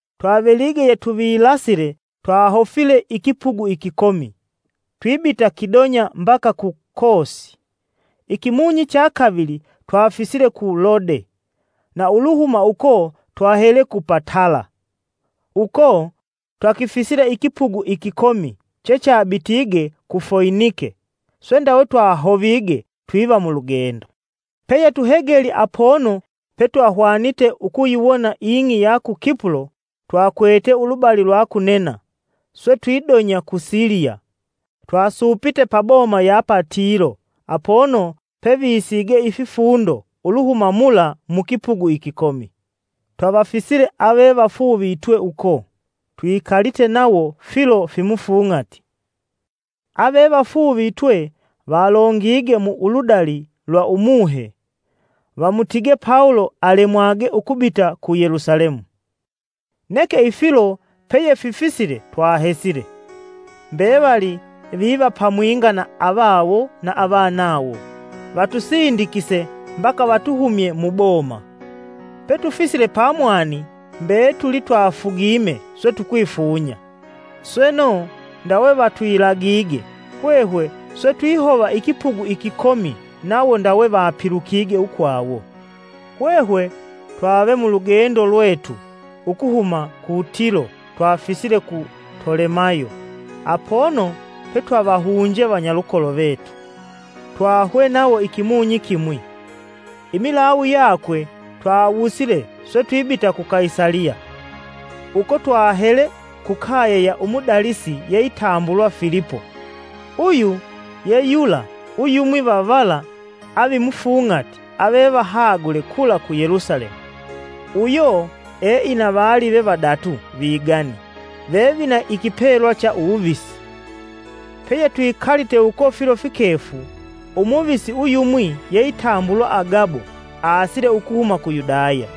Twavelige yetuvilasile, twahofile ikipugu ikikomi twibita kidonya mbaka ku Kosi. Ikimunyi cha kavili twafisile ku Lode, na uluhuma uko twahele ku Patala. Uko, twakifisile ikipugu ikikomi chechabitige ku Foinike swe ndawe twahovige twiva mulugendo. Peyetuhegelye apono petwahwanite ukuyiwona ing'i ya i Kipulo, twakwete ulubali lwa kunena swe twidonya ku Siliya. Twasupite paboma ya i Tilo apono pevisiige ififundo uluhuma mula mukipugu ikikomi. Twavafisile avevafuuvitwe uko, twikalite nawo filo fimufung'ati. Avevafuuvitwe valongige mu uludali lwa Umuhe, vamutige Pawulo alemwage ukubita ku Yelusalemu. Neke ifilo peyefisisile twahesile. Mbevali viva pamwinga na avawo na avanawo vatusindikise mbaka vatuhumye muboma. Petufisile pamwani mbetuli twafugime swe tukwifunya. Sweno, ndawe vatwilagige, hwehwe swe twihova ikipugu ikikomi, nawo ndawe vapilukige ukwawo. Hwehwe twave mulugendo lwetu ukuhuma ku Tilo twafisile ku Tolemayo apono petwavahunje vanyalukolo vetu., twahwe nawo ikimunyi kimwi. Imilawu yakwe twawusile swe twibita ku Kaisaliya. Uko twahele ku kaye ya umudalisi yeitambulwa Filipo uyu yeyula uyumwi va vala avimufung'ati avevahagule kula ku Yelusalemu. Uyo eina valive vadatu vigani vevavina ikipelwa cha uwuvisi. Peyetwikalite uko filo fikefu, Umuvisi uyumwi yeitambulwa Agabo asile ukuhuma ku Yudaya.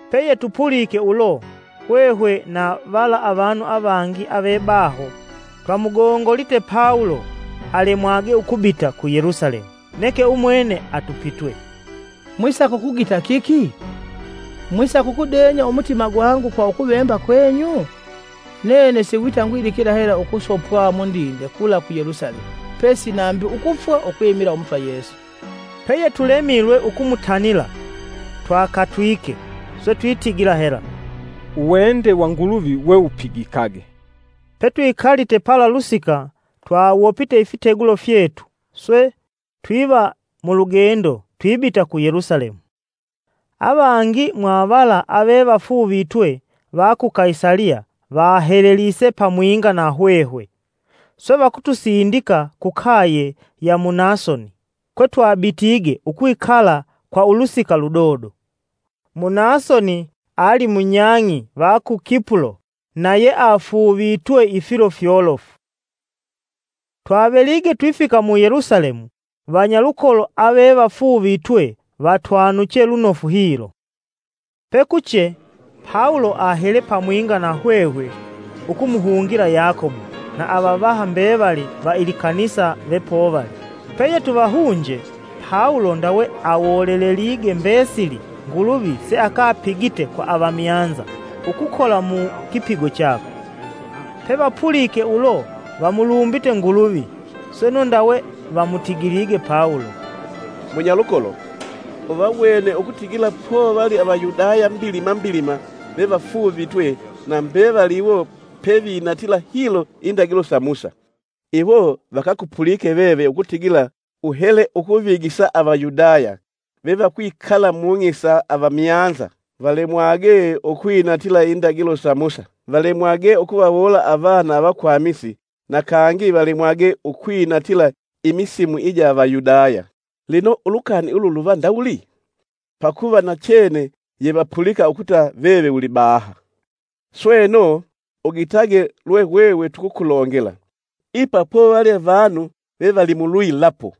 Peyetupulike ulo, hwehwe na vala avanu avangi avebaho twamugongolite Pawulo alemwage ukubita ku Yelusalemu. Neke umwene atupitwe, “Mwisaka ukugita kiki? Mwisaka ukudenya umutima gwangu kwa ukuvemba kwenyu? Nene si wita ngwidikila hela ukusopwa mundinde kula ku Yelusalemu pesi nambi ukufwa ukwimila Umutwa Yesu.” Peyetulemilwe ukumutanila twakatwike, swe twitigila hela, “Uwende wa Nguluvi wewupigikage!” Petwikalite pala lusika, twawopite ifitegulo fyetu swe, twiva mulugendo twibita ku Yelusalemu. Avangi mwa vala avevafuuvitwe va ku Kaisaliya vahelelise pamwinga na hwehwe, swe vakutusindika ku kaye ya Munasoni kwe twabitige ukwikala kwa ulusika ludodo. Munasoni ali munyang'i va ku Kipulo na yeafuuvitwe ifilo fyolofu. Twavelige twifika mu Yelusalemu, vanyalukolo avefauuvitwe vatwanuche lunofu hilo. Imilawu yakwe Pawulo ahele pamwinga na hwehwe ukumuhungila Yakobo, na avavaha mbevali va ilikanisa vepovali. Peyetuvahunje, Pawulo ndawe awolelelige mbesili Nguluvi seakapigite kwa avamyanza (avanu vesivamuseli Nguluvi) ukukola mukipigo chakwe. Pevapulike ulo, vamulumbite Nguluvi. Sweno ndawe vamutigilige Pawulo, “Munyalukolo, uvawene ukutigila povali Avayudaya mbilima mbilima vevafuuvitwe na mbevali iwo pevinatila hilo indagilo sa Musa. Iwo vakakupulike veve ukutigila uhele ukuvigisa Avayudaya vevakwikala mung'i sa avamyanza valemwage ukwinatila indagilo sa Musa, valemwage ukuvawoola avana vakwamisi na kangi valemwage ukwinatila imisimu ija Avayudaya. Lino, ulukani ulu luva ndawuli? Pakuva nachene yevapulika ukuta veve ulibaha. Sweno, ugitage lwe hwehwe tukukulongela. Ipa povali vanu vevali mulwilapo.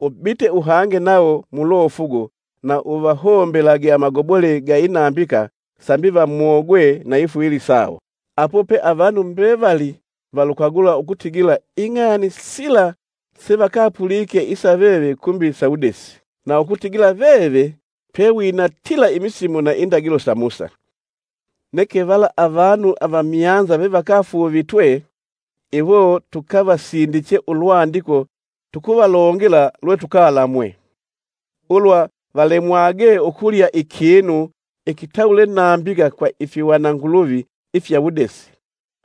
Ubite uhange nawo mulofugo na uvahombelage amagobole ga inambika sambi vamogwe na ifwili sawo. Apo pe avanu mbevali valukagula ukutigila ing'ani sila sevakapulike isa veve kumbi sawudesi, na ukutigila veve pewinatila imisimu na indagilo sa Musa. Neke vala avanu avamyanza vevakafuuvitwe, iwo tukavasindiche ulwandiko tukuvalongela lwe tukalamwe: ulwa valemwage ukulya ikinu ikitawule nambika kwa ifihwana nguluvi ifya uwudesi,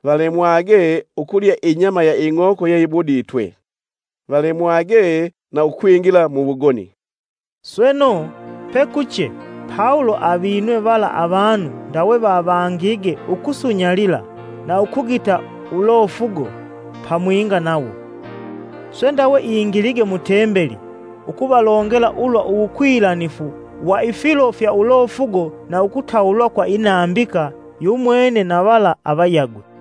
valemwage ukulya inyama ya ing'oko yeyibuditwe, valemwage na ukwingila muwugoni.” Sweno, Pekuche Pawulo avinwe vala avanu ndawe vavangige ukusunyalila na ukugita ulofugo pamwinga nawo. Swe ndawe ingilige mutembeli ukuvalongela ulwa uwukwilanifu wa ifilo fya ulofugo na ukutawulwa kwa inambika yumwene na vala avayagwe.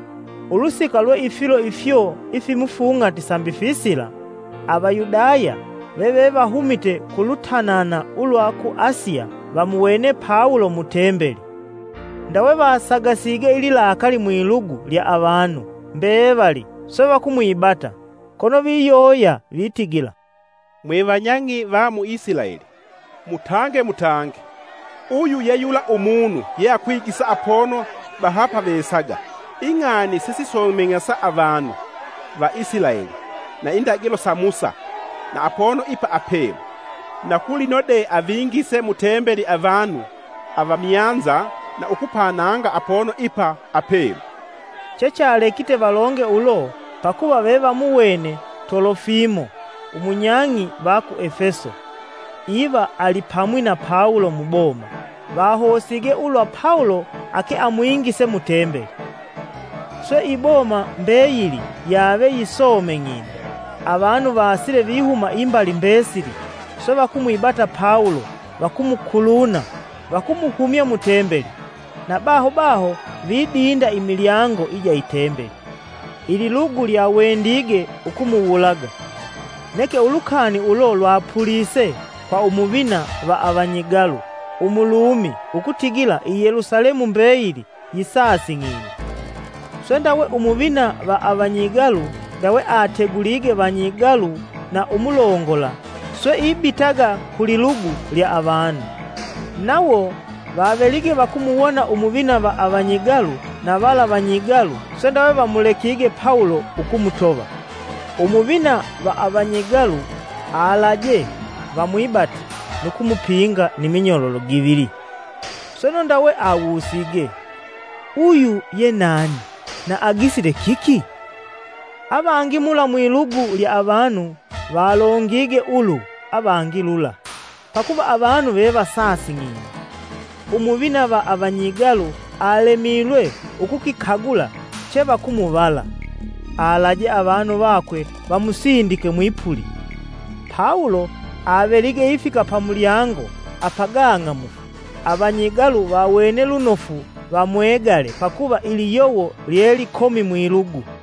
Ulusika lwe ifilo ifyo ifimufung'ati sambi fisila, Avayudaya vevevahumite ku lutanana ulwa ku Asiya vamuwene Pawulo mu Tembeli. Ndawe vasagasige ililakali mwilugu lya avanu mbevali, swe vakumwibata, kono viyoya vitigila, “Mwevanyang'i va mu Isilaeli, mutange, mutange! Uyu yeyula umunu yeakwigisa apono bahapavesaga ing'ani sesisomeng'asa avanu va Isilaeli, na indagilo sa Musa na apono ipa apelu. Na kulino de avingise mu tembeli avanu avamyanza na ukupananga apono ipa apelu.” Chechalekite valonge ulo pakuva vevamuwene Tolofimo, umunyang'i va ku Efeso, iva alipamwi na Pawulo muboma, vahosige ulwa Pawulo ake amwingise mu tembeli. Swe iboma mbeyili yave yisomeng'ine, avanu vasile vihuma imbali mbesili, swe vakumwibata Pawulo, vakumukuluna, vakumuhumya mu Tembeli, na baho baho vidinda imilyango ija i Tembeli. Ililugu lyawendige ukumuwulaga, neke ulukani ulo lwapulise kwa Umuvina va avanyigalu umulumi ukutigila i Yelusalemu mbeyili yisasing'ine. Swe, ndawe umuvina va avanyigalu ndawe ategulige vanyigalu na umulongola, swe ibitaga ku lililugu lya avanu. Nawo vavelige vakumuwona Umuvina va avanyigalu na vala vanyigalu, swe ndawe vamulekige Pawulo ukumutova. Umuvina va avanyigalu alaje vamwibate nu kumupinga ni minyololo givili. Sweno ndawe awusige, “Uyu ye nani, na agisile kiki?” Avangi mula mwilugu lya avanu valongige ulu avangi lula. Pakuva avanu vevasasing'ine, Umuvina va avanyigalu alemilwe ukukikagula chevakumuvala, alaje avanu vakwe vamusindike mwipuli. Pawulo avelige ifika pamulyango apagang'amufu, avanyigalu vawene lunofu vamwegale pakuva iliyowo lye likomi mwilugu.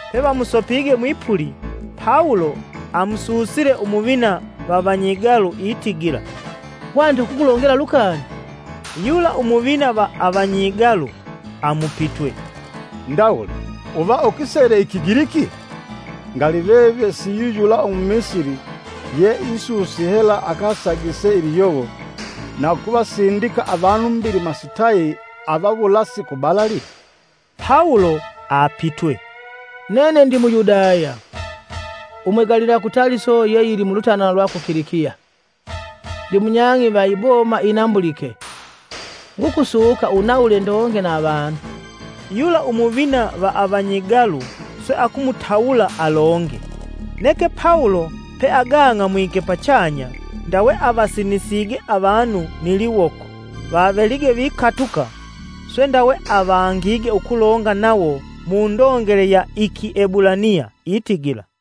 Pevamusopige mwipuli, Pawulo amususile Umuvina va vanyigalu itigila, “Hwanite ukukulongela lukani?” Yula Umuvina va avanyigalu amupitwe, “Ndawuli uva ukisele i kigiliki? Ngali veve siwiyuyula umumisili ye isusi hela akasagise liyowo na ukuvasindika avanu mbilima sitayi avawulasi kubalali!” Pawulo apitwe, “Nene ndi Muyudaya, umwegalilwa ku Taliso ye yili mulutanana lwa ku Kilikiya, ndimunyang'i va iboma inambulike. Ngukusuka, unawule ndonge na avanu.” Yula Umuvina va avanyigalu swe akumutawula alonge. Neke Pawulo pe agang'amwike pachanya, ndawe avasinisige avanu kwa liwoko vavelige vikatuka, swe ndawe avangige ukulonga nawo mundongele ya i Kiebulaniya itigila,